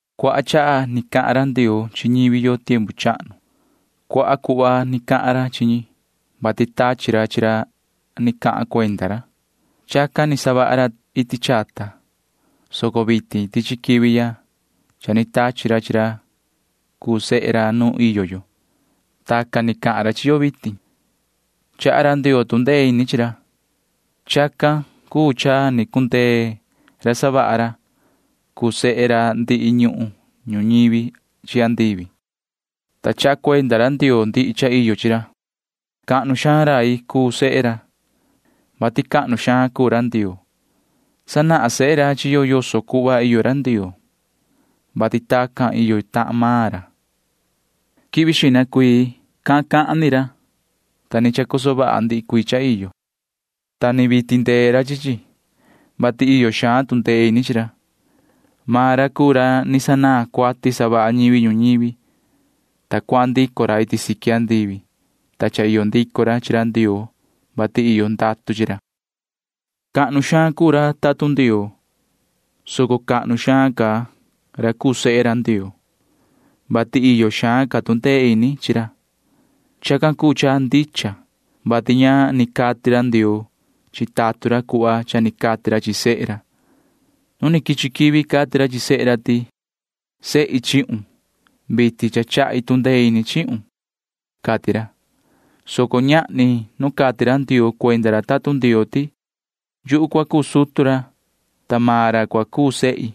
Cuaha chaha ni cahan ra Ndioo chi ñivi yo tiempu chahnu. Cuaha cuhva ni cahan ra chi ñi, vati tachi ra chi ra ni cahan cuenda ra. Chacan ni savaha ra iti chata, soco vitin tichi quivi ya cha ni tachi ra chi ra cuu sehe ra nu iyo yo. Tacan ni cahan ra chi yo vitin. Chaha ra Ndioo tu ndee ini chi ra. Chacan cuu cha ni cundee ra savaha ra cuu sehe ra ndihi ñuhun ñuñivi chi andivi, ta chaha cuenda ra Ndioo ndihi cha iyo chi ra. Cahnu xaan rai cuu sehe ra, vati cahnu xaan cuu ra Ndioo. Sanahan sehe ra chi yo yoso cuhva iyo ra Ndioo, vati tacan iyo tahan maan ra. Quivi xihna cuii cahan cahan ni ra, ta ni chacoso vaha ndihi cuii cha iyo, ta ni vii tindee ra chi chi, vati iyo xaan tu ndee ini chi ra. Maan ra cuu ra ni sanaan cuati savaha ñivi ñuñivi, ta cuahan ndico ra iti siqui andivi, ta cha iyo ndico ra chi ra Ndioo, vati iyo ndatu chi ra. Cahnu xaan cuu ra tatun Ndioo, soco cahnu xaan ca ra cuu sehe ra Ndioo, vati iyo xaan ca tu ndee ini chi ra. Chacan cuu cha ndicha, vati ña ni cati ra Ndioo chi tatun ra cuhva cha ni cati ra chi sehe ra. Nu ni quichi quivi cati ra chi sehe ra ti: Sehi chihun. Vitin cha chahi tu ndee ini chihun, cati ra, soco ñahni nu cati ra Ndioo cuenda ra tatun Ndioo ti: Yuhu cua cuu sutu ra, ta maan ra cua cuu sehi.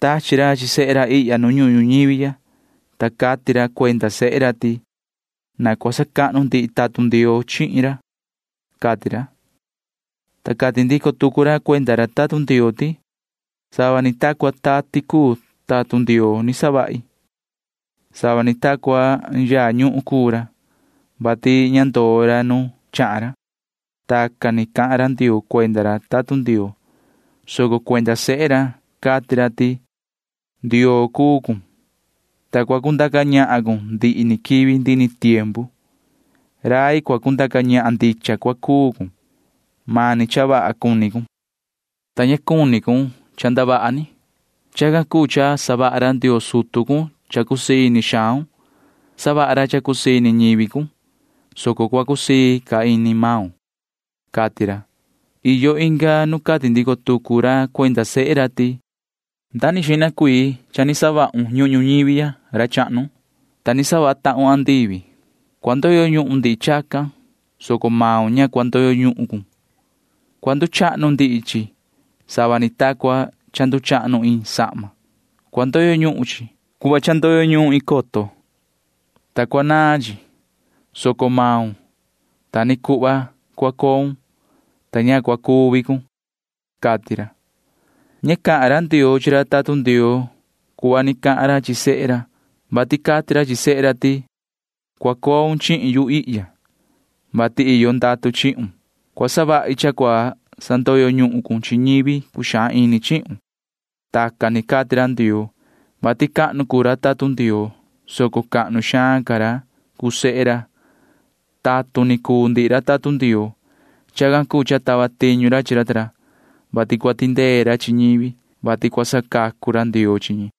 Tachi ra chi sehe ra ihya nu ñuhun ñuñivi ya, ta cati ra cuenda sehe ra ti: Na cua sacahnu ndihi tatun Ndioo chihin ra, cati ra. Ta cati ndico tucu ra cuenda ra tatun Ndioo ti: Sava ni ta cua tati cuu tatun Ndioo ni savahi. Sava ni ta cua yaa ñuhun cuu ra, [vati ña ndoo ra nu chahan ra,] Tacan ni cahan ra Ndioo cuenda ra tatun Ndioo, soco cuenda sehe ra cati ra ti: Yoho Ndioo cuu cun, ta cua cundaca ñahan cun ndihi ni quivi ndihi ni tiempu. Rai cua cundaca ñahan ndicha cua cuu cun. Mani cha vaha cuni cun, ta ña cuni cun cha ndavaha ni. Chacan cuu cha savaha ra Ndioo sutu cun cha cusii ini xaun. Savaha ra cha cusii ini ñivi cun, soco cua cusii ca ini maun, cati ra. Iyo inga nu cati ndico tucu ra cuenda sehe ra ti: Nda ni xihna cuii cha ni savahun ñuhun ñuñivi ya, yoho ra chahnu, ta ni savaha tahun andivi. Cua ndoyo ñuhun ndihi chacan, soco maun ña cua ndoyo ñuhun cun. Cua nduchahnu ndihi chi sava ni ta cua cha nduchahnu iin sahma. Cua ndoyo ñuhun chi [cuhva cha ndoyo ñuhun iin coton], ta cua naan chi, soco maun ta ni cuhva cua coun, ta ña cua cuvi cun, cati ra. Ña cahan ra Ndioo chi ra tatun Ndioo cuhva ni cahan ra chi sehe ra, vati cati ra chi sehe ra ti: Cua coun chihin yu ihya, vati iyo ndatu chihun. Cua savahi cha cua sandoyo ñuhun cun chi ñivi cuxaan ini chihun. [Tacan ni cati ra Ndioo, vati cahnu cuu ra tatun Ndioo, soco cahnu xaan ca ra cuu sehe ra.] Tatun ni cuu ndihi ra tatun Ndioo. Chacan cuu cha tava tiñu ra chi ra ta ra, vati cua tindee ra chi ñivi, vati cua sacacu ra Ndioo chi ñi.